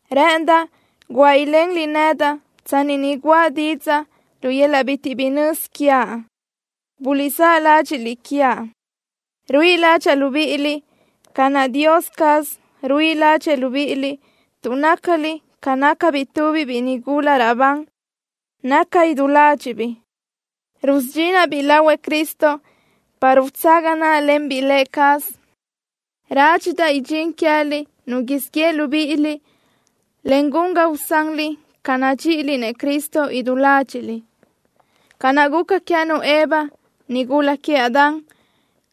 Rë́ʼëndaʼ guáʼ ilenliʼ nedaʼ tsanni ni guʼa didzaʼ lu yöl-laʼ bitiʼ bi nözi quiaʼ. Buliʼsáʼ ládxiʼliʼ quiaʼ. Ruíʼi ládxaʼa libíʼiliʼ ca naʼ Dios caz ruíʼi ládxëʼë libíʼiliʼ, tuʼ nácaliʼ ca nácabiʼ tubiʼ biʼi nigula raʼbandoʼ, naca idú ládxiʼbiʼ, rusudxinaʼ-biʼ lahuëʼ Cristo para utsaga náʼalenbiʼ Lë cazëʼ. Rádxidaʼ idxín queë́liʼ nu siʼ yeʼe libíʼiliʼ, en gun ga usanliʼ ca nadxíʼiliʼ-nëʼ Cristo idú ládxiʼliʼ, ca naʼ guca queë́nu Eva, nigula queëʼ Adán,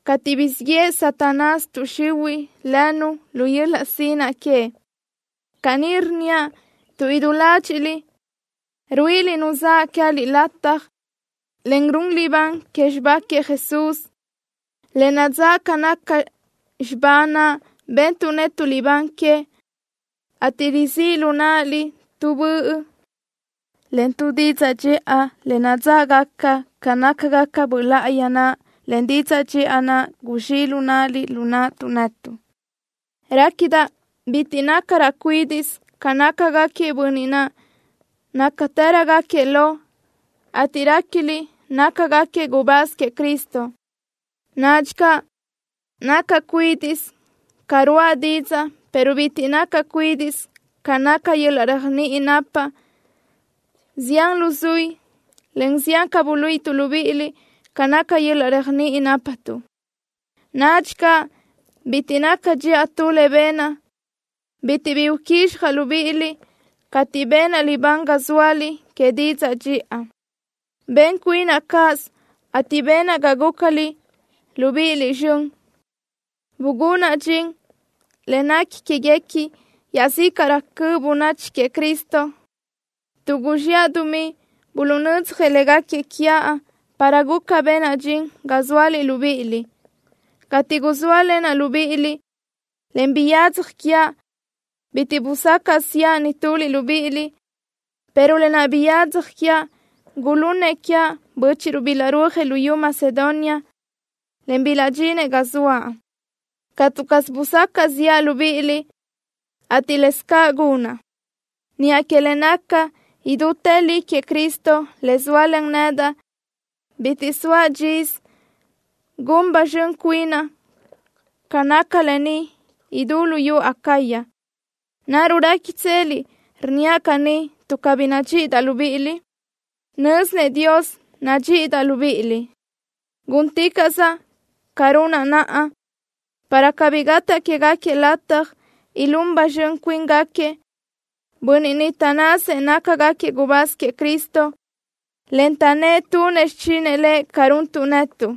cateʼ guzxíʼ yeʼe Satanás tuʼ xihuiʼ lënu lu yöl-laʼ sinaʼ que. Caní rnníaʼ tuʼ idú ládxiʼliʼ ruíʼiliʼ nu zaʼ queë́liʼ lataj, en run libán que xibá queëʼ Jesús, le nadzáʼ ca naca xibá naʼ bentuʼ netuʼ libán que, ateʼ rizíʼ lu náʼaliʼ tu böʼ, en tu didzaʼ dxiʼa le nadzáʼgaca ca nácagaca Böʼ Láʼayi naʼ, en didzaʼ dxiʼa naʼ guzxíʼ lu náʼaliʼ lu naʼtuʼ netuʼ. Réquidaʼ bitiʼ nácaraʼ cuídiʼsö ca nácagaquiëʼ bönniʼ niʼ nácatërögaquiëʼ lo, ateʼ réquiliʼ nácagaquiëʼ gubáz queëʼ Cristo. Nadxi caʼ nacaʼ cuídiʼsö ca ruáʼa didzaʼ, pero bitiʼ nacaʼ cuídiʼsö ca naca yöl-laʼ réajniʼi napaʼ. Zián luzuí, en zián ca buluíʼituʼ libíʼiliʼ ca naca yöl-laʼ réajniʼi nápatuʼ. Nadxi caʼ bitiʼ naca dxiʼa tu le benaʼ, bitiʼ bi buquizxjaʼ libíʼiliʼ cateʼ benaʼ libán ga zóaliʼ que didzaʼ dxiʼa. Ben cuinaʼ cáʼasö, ateʼ benaʼ ga gúcaliʼ libíʼiliʼ zxön. Bugunaʼ dxin le nequi quéguequi iaʼzícaʼrö cöʼ bönachi queëʼ Cristo, tuʼ guzxiʼa dumí buluʼnödzjëʼ légaquiëʼ quiaʼ para guca benaʼ dxin ga zóaliʼ libíʼiliʼ. Cateʼ guzóalenaʼ libíʼiliʼ, en biyadzaj quiaʼ, bitiʼ busacaʼ ziʼa nituliʼ libíʼiliʼ, pero lë naʼ biyadzaj quiaʼ, gulunnëʼ quiaʼ bö́chiʼruʼ bilaʼrúajëʼ luyú Macedonia, en bilaʼdxinëʼ ga zoaʼ. Catu caz busacaʼ ziʼa libíʼiliʼ, ateʼ laʼ lë́bisö ca gunaʼ. Niʼa que le naca idútë li queëʼ Cristo le zóalen nedaʼ, bitiʼ soaʼ dxisö, gun ba zxön cuinaʼ ca naca lë ni idú luyú Acaya. ¿Naruʼ réquitseliʼ rnníaʼ caní tuʼ cabí nadxíʼidaʼ libíʼiliʼ? Nö́zinëʼ Dios nadxíʼidaʼ libíʼiliʼ. Gúnticaʼsaʼ ca runaʼ naʼa, para cabí gataʼ quégaquiëʼ lataj ilún ba zxön cuíngaquiëʼ bönniʼ niʼ taʼnnasëʼ nácagaquiëʼ gubáz queëʼ Cristo, en taʼnnë́ʼ tunëʼ xichinëʼ Lëʼ ca runtuʼ netuʼ.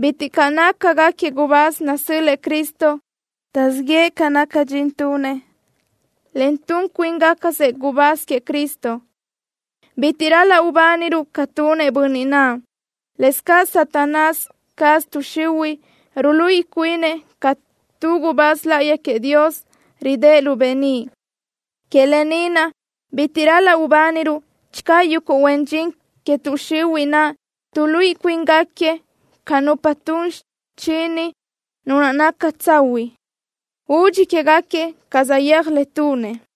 Bitiʼ caʼ nácagaquiëʼ gubáz nasö́l-lëʼë Cristo. Taʼzíʼ yëʼë ca naca dxin tunëʼ, en tun cuíngacasëʼ gubáz queëʼ Cristo. Bitiʼ ral-laʼ ubániruʼ ca tunëʼ bönniʼ naʼ. Lëscaʼ Satanás caz, tuʼ xihuiʼ, ruluíʼi cuini ca tu gubáz láʼayi queëʼ Dios, ridë́ʼ lu beníʼ. Que lë ni naʼ bitiʼ ral-laʼ ubániruʼ channö yuguʼ huen dxin que tuʼ xihuiʼ naʼ tuʼluíʼi cuíngaquiëʼ ca nupa tun xichini Nu naʼ naca tsahuiʼ. Udxi quégaquiëʼ ca saʼyéaj le tunëʼ.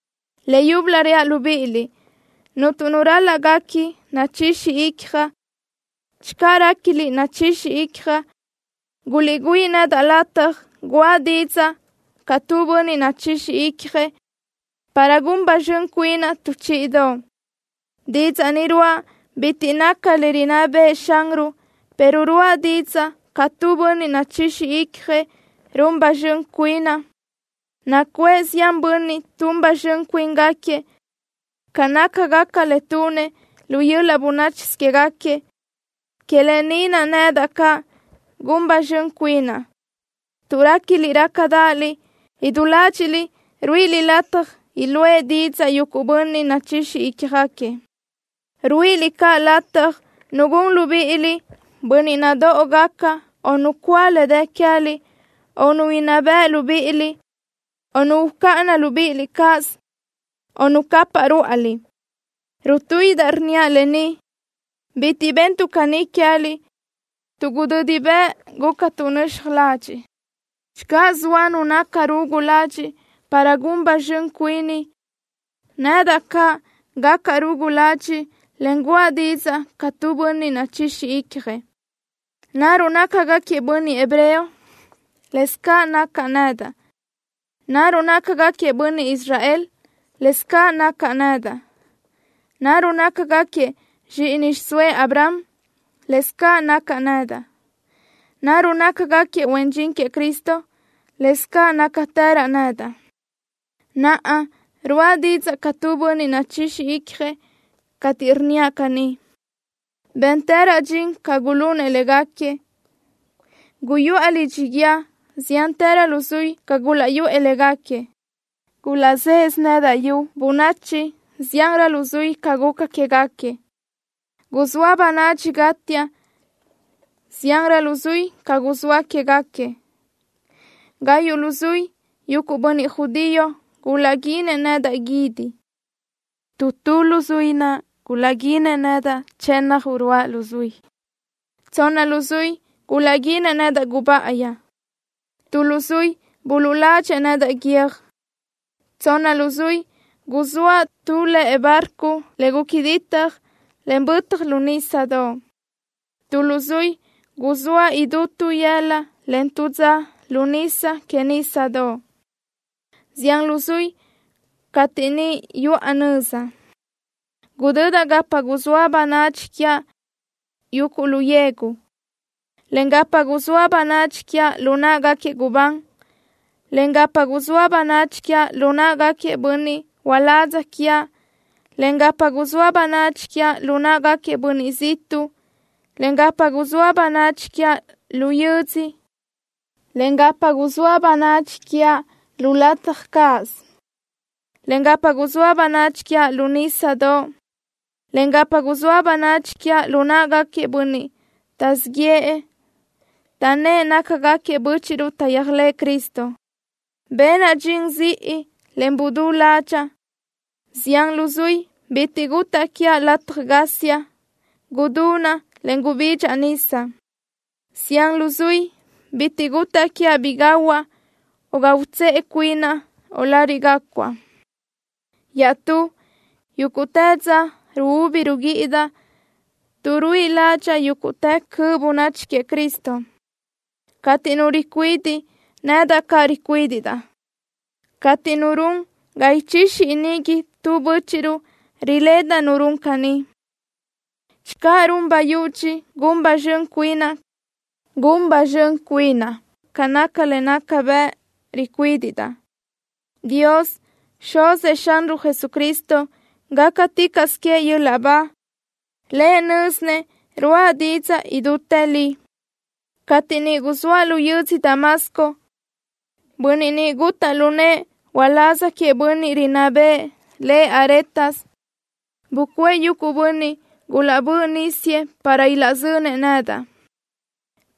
Leyúbölö reaʼ libíʼiliʼ: Cuntu nu ral-laʼ guequi nachixi icjaʼ. Channö réquiliʼ nachixi icjaʼ, guliʼgüíʼ nedaʼ lataj guʼa didzaʼ ca tu bönniʼ nachixi icjëʼ, para gun ba zxön cuinaʼ tu chíʼidoʼ. Didzaʼ ni ruáʼa bitiʼ naca le rinná bëʼë Xanruʼ, pero ruáʼa didzaʼ ca tu bönniʼ nachixi icjëʼ, run ba zxön cuinaʼ. Nacuʼë zián bönniʼ tun ba zxön cuíngaquiëʼ ca nácagaca le tunëʼ lu yöl-laʼ bönáchisö quégaquiëʼ. Que lë ni naʼ, nedaʼ caʼ gun ba zxön cuinaʼ. Tuʼ réquiliʼ rácadaʼaliʼ, idú ládxiʼliʼ ruíʼiliʼ lataj iluʼë didzaʼ yuguʼ bönniʼ nachixi ícjagaquiëʼ. Ruíʼiliʼ caʼ lataj nu gun libíʼiliʼ bönniʼ nadóʼogaca, o nu cúa le dë queë́liʼ, o nu inná beʼe libíʼiliʼ, o nu ucáʼana libíʼiliʼ cáʼasö, o nu capaʼ rúʼaliʼ. Rutuíʼidaʼ rnníaʼ lë ni: Bitiʼ bentuʼ caní queë́liʼ tuʼ gudödi bëʼ gúcatuʼ nöxaj ladxiʼ. Channö zoa nu naca rugu ladxiʼ para gun ba zxön cuini, nedaʼ caʼ gacaʼ rugu ladxiʼ, en guʼa didzaʼ ca tu bönniʼ nachixi icjëʼ. ¿Naruʼ nácagaquiëʼ bönniʼ hebreo? Lëscaʼ nacaʼ nedaʼ. ¿Naruʼ nácagaquiëʼ bönniʼ Israel? Lëscaʼ nacaʼ nedaʼ. ¿Naruʼ nácagaquiëʼ zxíʼini xiʼsóëʼ Abraham? Lëscaʼ nacaʼ nedaʼ. ¿Naruʼ nácagaquiëʼ huen dxin queëʼ Cristo? Lëscaʼ nácatëraʼ nedaʼ. (Naʼa ruáʼa didzaʼ ca tu bönniʼ nachixi icjëʼ cateʼ rnníaʼ caní.) Béntëraʼ dxin ca gulunëʼ légaquiëʼ. Guyuʼa lidxi guíë ziánrö luzuí ca gulaʼyuʼë légaquiëʼ. Gulaʼzéʼedaʼ nedaʼ yu bönachi ziánrö luzuí ca guca quégaquiëʼ. Guzóa bönadxi gátiaʼ ziánrö luzuí ca guzóa quégaquiëʼ. Gayuʼ luzuí yuguʼ bönniʼ judío gulaʼguínëʼ nedaʼ guídi. Tu tu luzuí naʼ gulaʼguínëʼ nedaʼ chënna uruáʼ luzuí. Tsonna luzuí gulaʼguínëʼ nedaʼ gubáʼayi. Tu luzuí buluʼladxëʼ nedaʼ guiö́j. Tsonna luzuí guzóaʼ tu lëʼe barco le guca ditaj, en bötaj lu nísadoʼ. Tu luzuí guzóaʼ idú tu yëla, en tu dza lu nisa que nísadoʼ. Zián luzuí cateʼ niʼ yuʼa nöza, gudödaʼ gapa guzóa bönadxi quiaʼ yuguʼ lu yegu, en gapa guzóa bönadxi quiaʼ lu náʼagaquiëʼ gubán, en gapa guzóa bönadxi quiaʼ lu náʼagaquiëʼ bönniʼ uládz quiaʼ, en gapa guzóa bönadxi quiaʼ lu náʼagaquiëʼ bönniʼ ziʼtuʼ, en gapa guzóa bönadxi quiaʼ lu yödzö, en gapa guzóa bönadxi quiaʼ lu lataj cáʼasö, en gapa guzóa bönadxi quiaʼ lu nísadoʼ, en gapa guzóa bönadxi quiaʼ lu náʼagaquiëʼ bönniʼ taʼzíʼ yëʼë, taʼnnë́ʼ nácagaquiëʼ bö́chiʼruʼ taʼyéajlëʼë Cristo. Benaʼ dxin ziʼi, en gudú ládxaʼa. Zián luzuí bitiʼ gutaʼ quiaʼ lataj gásiaʼ. Gudunaʼ, en gubidxaʼ nisa. Zián luzuí bitiʼ gutaʼ quiaʼ bi gahuaʼ, o ga utsëʼe cuinaʼ, o lariʼ gácuaʼ. Iaʼstú, yúguʼtë dza ruúbi ruguíʼidaʼ tuʼ ruíʼidaʼ ládxaʼa yúguʼtë cöʼ bönachi queëʼ Cristo. Cateʼ nu ricuidiʼ, nedaʼ caʼ ricuídiʼdaʼ. Cateʼ nu run ga ichixi iníguinëʼ tu bö́chiʼruʼ, riledaʼ nu run caní. Channö run bayudxi gun ba zxön cuinaʼ, gun ba zxön cuinaʼ ca naca le nácagaca bëʼ ricuídiʼdaʼ. ¡Dios, Xuzëʼ Xanruʼ Jesucristo, gácaticaʼsö queëʼ yöl-laʼ ba! ¡Lëʼ nö́zinëʼ ruáʼa didzaʼ idútë li! Cateʼ niʼ guzóaʼ lu yödzö Damasco, bönniʼ niʼ gutaʼ lu nëʼë uláz queëʼ bönniʼ rinná bëʼë, lëʼ Aretas, bucuʼë yuguʼ bönniʼ gulaʼbö́ʼ nísiëʼ para ilaʼzönëʼ nedaʼ,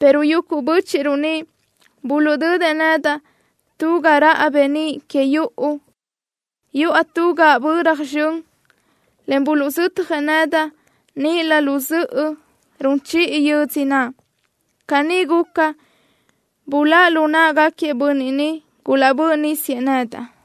pero yuguʼ bö́chiʼruʼ niʼ buluʼdödëʼ nedaʼ tu ga raʼa beníʼ que yuʼu, yuʼa tu gaʼböra zxön, en buluʼzötjëʼ nedaʼ níʼilö lu zöʼö run chiʼi yödzö naʼ. Caní guca, buláʼ lu náʼagaquiëʼ bönniʼ niʼ gulaʼbö́ʼ nísiëʼ nedaʼ.